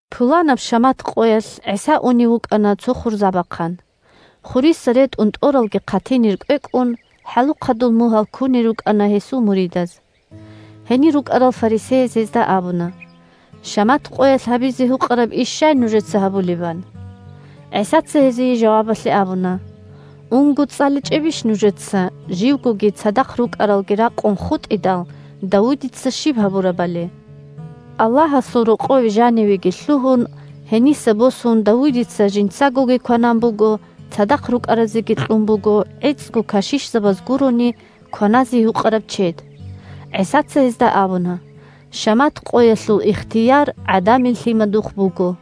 Пуланаб шамат къоялъ ГӀиса унев вукӀана цо хурзабахъан. Хуриса ретӀун тӀоралги хъатинир кӀвекӀун, хӀалухъадул мугьал кунел рукӀана гьесул муридаз. Гьенир рукӀарал фарисеяз гьезда абуна: – Шамат къоялъ гьабизе гьукъараб иш щай нужеца гьабулеб? – ан. ГӀисаца гьезие жавабалъе абуна: – Унго, цӀаличӀебищ нужеца, живгоги цадахъ рукӀаралги ракъун хутӀидал, Давудица щиб гьабурабали? Аллагьасул рокъове жанивеги лъугьун, гьениса босун Давудица жинцагоги кванан буго, цадахъ рукӀаразеги кьун буго гӀицӀго кашишзабаз гурони кваназе гьукъараб чед. ГӀисаца гьезда абуна: – Шамат къоялъул ихтияр ГӀадамил Лъимадухъ буго!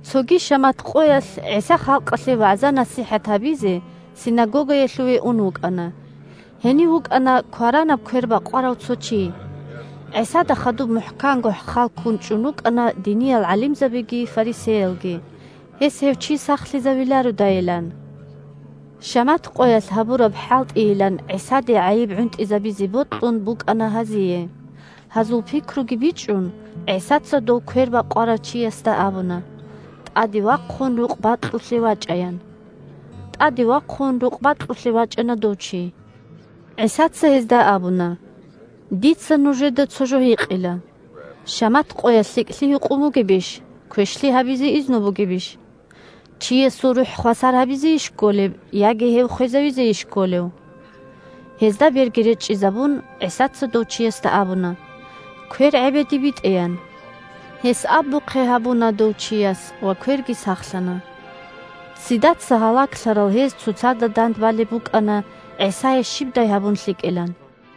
Цоги шамат къоялъ ГӀиса халкъалъе вагӀза-насихӀат гьабизе синагогаялъуве ун вукӀана. Гьенив вукӀана кваранаб квер бакъварав цо чи. ГӀисада хадуб мухӀканго хал ккун чӀун рукӀана диниял гӀалимзабиги фарисеялги, гьес гьев чи сахлъизавилародайилан. Шамат къоялъ гьабураб хӀалтӀийилан ГӀисаде гӀайиб гӀунтӀизабизе бокьун букӀана гьазие. Гьазул пикруги бичӀчӀун, ГӀисаца дов квер бакъварав чиясда абуна: – ТӀаде вахъун рукъ бакьулъе вачӀа, – ян. ТӀаде вахъун, рукъ бакьулъе вачӀана дов чи. ГӀисаца гьезда абуна: – Дица нужеда цо жо гьикъила: шамат къоялъ лъикӀлъи гьукъун бугебищ, квешлъи гьабизе изну бугебищ? Чиясул рухӀ хвасар гьабизейищ кколеб, яги гьев хвезавизейищ кколев? Гьезда берги речӀчӀизабун, ГӀисаца дов чиясда абуна: – Квер гӀебеде битӀе, – ян. Гьес абухъе гьабуна дов чияс ва кверги сахлъана. Ццидаца гьалаглъарал гьез цоцазда дандбалеб букӀана ГӀисае щибдай гьабун лъикӀилан.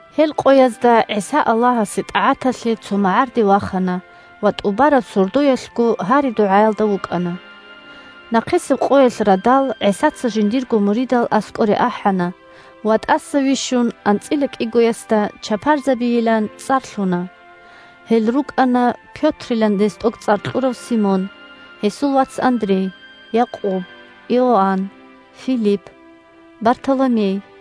Гьел къоязда ГӀиса Аллагьасе тӀагӀаталъе цо магӀарде вахана ва тӀубараб сордоялъго гьари-дугӀаялда вукӀана. Нахъисеб къоялъ радал ГӀисаца жиндирго муридал аскӀоре ахӀана ва, тӀаса вищун, анцӀила кӀигоясда чапарзабийилан цӀар лъуна. Гьел рукӀана: Пётрилан гьес тӀокӀцӀар кьурав Симон, гьесул вац Андрей, Якъуб, Иоанн, Филипп, Бартоломей,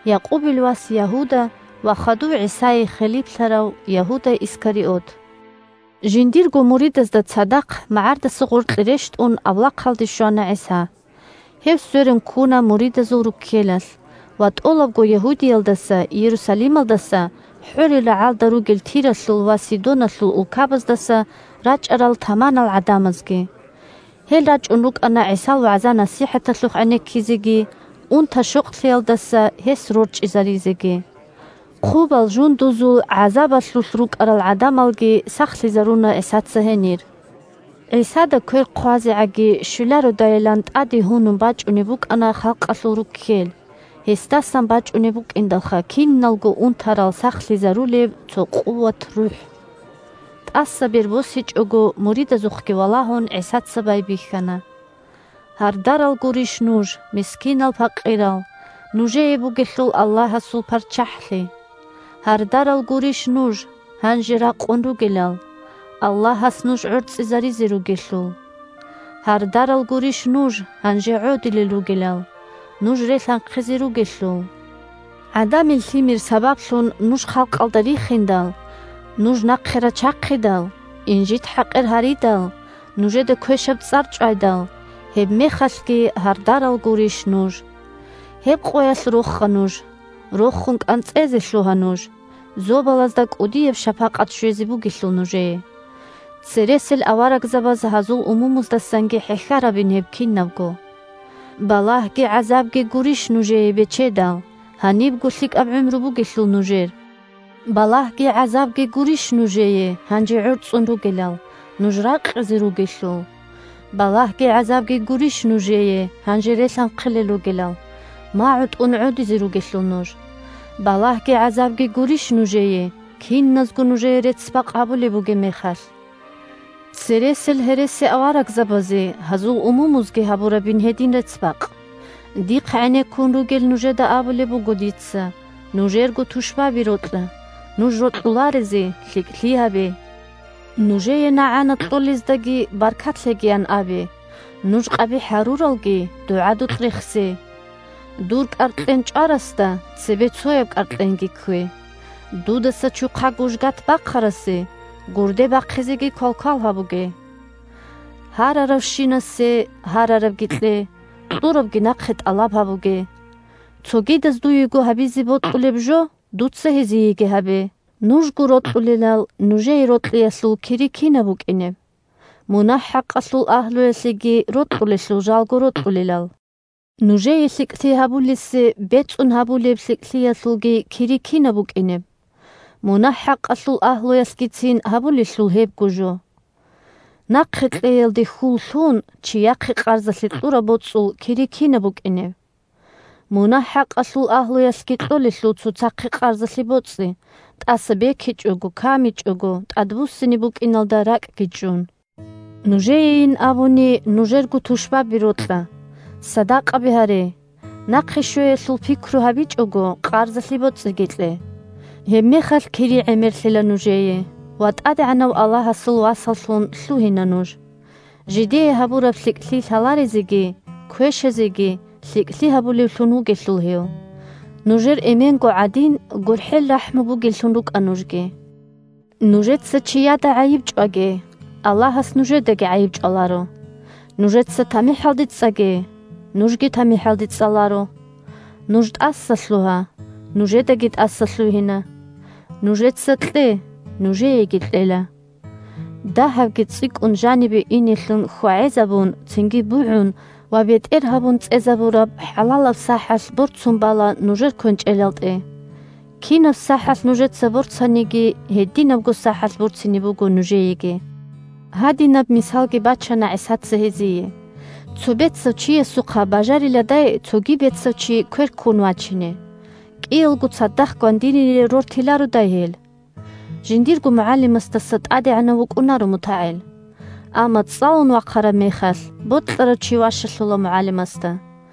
Якъубил вас Ягьуда ва хадув ГӀисае хилиплъарав Ягьуда Искариот. Жиндирго муридазда цадахъ магӀардаса гъоркье рещтӀун, авлахъалде щвана ГӀиса. Гьев сверун ккуна муридазул руккелалъ ва тӀолабго Ягьудиялдаса, Иерусалималдаса, хӀорил рагӀалда ругел Тиралъул ва Сидоналъул улкабаздаса рачӀарал таманал гӀадамазги. Гьел рачӀун рукӀана ГӀисал вагӀза-насихӀаталъухъ гӀенеккизеги, унта-щокълъиялдаса гьес рорчӀизаризеги. Хъубал жундузул гӀазабалъулъ рукӀарал гӀадамалги сахлъизаруна ГӀисаца гьенир. ГӀисада квер хъвазегӀаги щвелародайилан тӀаде гьунун бачӀунеб букӀана халкъалъул руккел, – гьесдасан бачӀунеб букӀиндалха киналго унтарал сахлъизарулеб цо къуват-рухӀ. ТӀаса бер босичӀого муридазухъги валагьун, ГӀисаца байбихьана: – Гьардарал гурищ нуж, мискинал-пакъирал, нужее бугелъул Аллагьасул ПарччахӀлъи. Гьардарал гурищ нуж, гьанже ракъун ругелал, Аллагьас нуж гӀорцӀизаризе ругелъул. Гьардарал гурищ нуж, гьанже гӀодилел ругелал, нуж релъанхъизе ругелъул. ГӀадамил Лъимер сабаблъун нуж халкъалда рихиндал, нуж нахъе рачахъидал, инжит-хӀакъир гьаридал, нужеда квешаб цӀар чӀвайдал, – гьебмехалъги гьардарал гурищ нуж. Гьеб къоялъ роха нуж, рохун кӀанцӀезе лъугьа нуж, зобалазда кӀудияб шапакъат щвезе бугелъул нужее. Цересел аварагзабаз гьазул умумуздасанги хӀехьарабин гьеб кинабго. Балагьги гӀазабги гурищ нужее, бечедал, гьанибго лъикӀаб гӀумру бугелъул нужер. Балагьги гӀазабги гурищ нужее, гьанже гӀорцӀун ругелал, нуж ракъизе ругелъул. Балагьги гӀазабги гурищ нужее, гьанже релъанхъилел ругелал, магӀу тӀун гӀодизе ругелъул нуж. Балагьги гӀазабги гурищ нужее, киназго нужее рецц-бакъ гьабулеб бугеб мехалъ! Цересел гьересиаварагзабазе гьазул умумузги гьабурабин гьедин рецц-бакъ. Дихъ гӀенеккун ругел нужеда абулеб буго дица: нужерго тушбаби рокьа, нуж рокьуларезе лъикӀлъи гьабе. Нужее нагӀана кьолездаги баркат лъегиян абе, нуж къабихӀ гьаруралги дугӀадулъ рехсе, Дур кӀаркьен чӀварасда цебе цояб кӀаркьенги ккве, дудаса чухъа-гужгат бахъарасе гурде бахъизеги квалквал гьабуге. Гьараравщинасе гьарарабги кье, кьурабги нахъе тӀалаб гьабуге. Цогидаз дуего гьабизе бокьулеб жо дуца гьезиеги гьабе. Нужго рокьулелал нужее рокьиялъул кири кинаб букӀинеб? Мунагь-хӀакъалъул агьлуялъеги рокьулелъул жалго рокьулелал. Нужее лъикӀлъи гьабулесе бецӀун гьабулеб лъикӀлъиялъулги кири кинаб букӀинеб? Мунагь-хӀакъалъул агьлуялъгицин гьабулелъул гьебго жо. Нахъе кьеялде хьул лъун чияхъе къарзалъе кьураб боцӀул кири кинаб букӀинеб? Мунагь-хӀакъалъул агьлуялъги кьолелъул цоцахъе къарзалъе боцӀи, тӀаса бекичӀого, камичӀого тӀадбуссине букӀиналда ракӀги чӀун. Нужеейин абуни нужерго тушбаби рокьа, садакъаби гьаре, нахъе щвеялъул пикру гьабичӀого къарзалъе боцӀиги кье. Гьебмехалъ кири гӀемерлъила нужее, ва ТӀадегӀанав Аллагьасул васаллъун лъугьина нуж. Жидее гьабураб лъикӀлъи лъаларезеги квешазеги лъикӀлъи гьабулевлъун вугелъул гьев. Нужер Эменго гӀадин гурхӀел-рахӀму бугеллъун рукӀа нужги. Нужеца чияда гӀайиб чӀваге, – Аллагьас нужедаги гӀайиб чӀваларо; нужеца тамихӀалде цӀаге, – нужги тамихӀалде цӀаларо. Нуж тӀасалъугьа, – нужедаги тӀасалъугьина. Нужеца кье, – нужееги кьела. Дагьабги цӀикӀкӀун жанибе инелъун хьвагӀезабун, цинги бугӀун ва бетӀер гьабун цӀезабураб хӀалалаб сахӀалъ борцун бала нужер квенчӀелтӀе. Кинаб сахӀалъ нужеца борцаниги, гьединабго сахӀалъ борцине буго нужееги. Гьадинаб мисалги бачана ГӀисаца гьезие: – Цо бецав чиясухъа бажариладай цоги бецав чи квер ккун вачине? КӀиялго цадахъ гвандинире рортилародай гьел? Жиндирго мугӀалимасдаса тӀадегӀанав вукӀунаро мутагӀил. Амма, цӀалун вахъараб мехалъ, бокьарав чи ващалъула мугӀалимасда.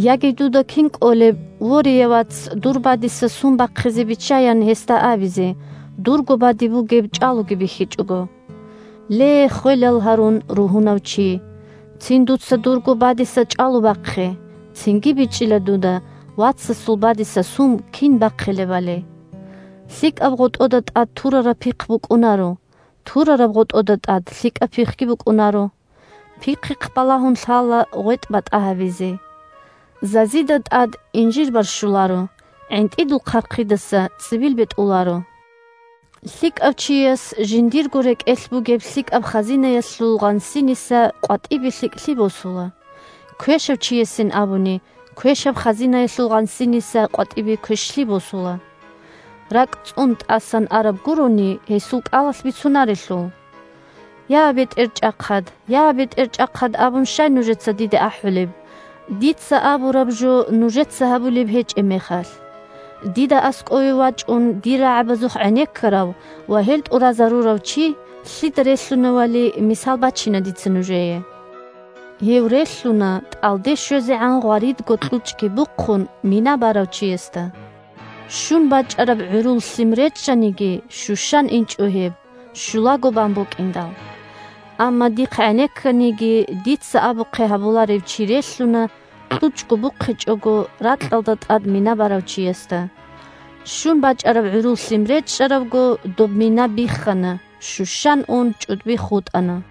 Яги дуда кин кӀолеб: «Ворея, вац, дур бадиса сум бахъизе биччай!» – ян гьесда абизе, дурго бадиб бугеб чӀалуги бихьичӀого? Ле, ххвелал гьарун ругьунав чи, цин дуца дурго бадиса чӀалу бахъе, цинги бичӀчӀила дуда вацасул бадиса сум кин бахъилебали. ЛъикӀаб гъотӀода тӀад турараб пихъ букӀунаро, турараб гъотӀода тӀад лъикӀаб пихъги букӀунаро. Пихъихъ балагьун лъала гъветӀ батӀа гьабизе. Зазида тӀад инжир барщуларо, гӀинтӀидул хъархъидаса цӀибил бетӀуларо. ЛъикӀав чияс жиндирго рекӀелъ бугеб лъикӀаб хазинаялъул гъансиниса къватӀибе лъикӀлъи босула, квешав чиясин абуни квешаб хазинаялъул гъансиниса къватӀибе квешлъи босула. РакӀ цӀун тӀасан араб гурони гьесул кӀалалъ бицунарелъул. «Я, БетӀерчӀахъад! Я, БетӀерчӀахъад!» абун щай нужеца диде ахӀулеб, дица абураб жо нужеца гьабулеб гьечӀеб мехалъ? Дида аскӀове вачӀун, дир рагӀабазухъ гӀенеккарав ва гьел тӀуразарурав чи лъида релълъуневали мисал бачина дица нужее: гьев релълъуна тӀалде щвезегӀан гъваридго кьучӀги бухъун, мина барав чиясда. Щун бачӀараб гӀурул лъим речӀчӀаниги, щущан инчӀо гьеб, щулаго бан букӀиндал. Амма дихъ гӀенекканиги, дица абухъе гьабуларев чи релълъуна, кьучӀго бухъичӀого, ракьалда тӀад мина барав чиясда. Щун бачӀараб гӀурул лъим речӀчӀарабго, доб мина биххана, щущан ун, чӀудби хутӀана.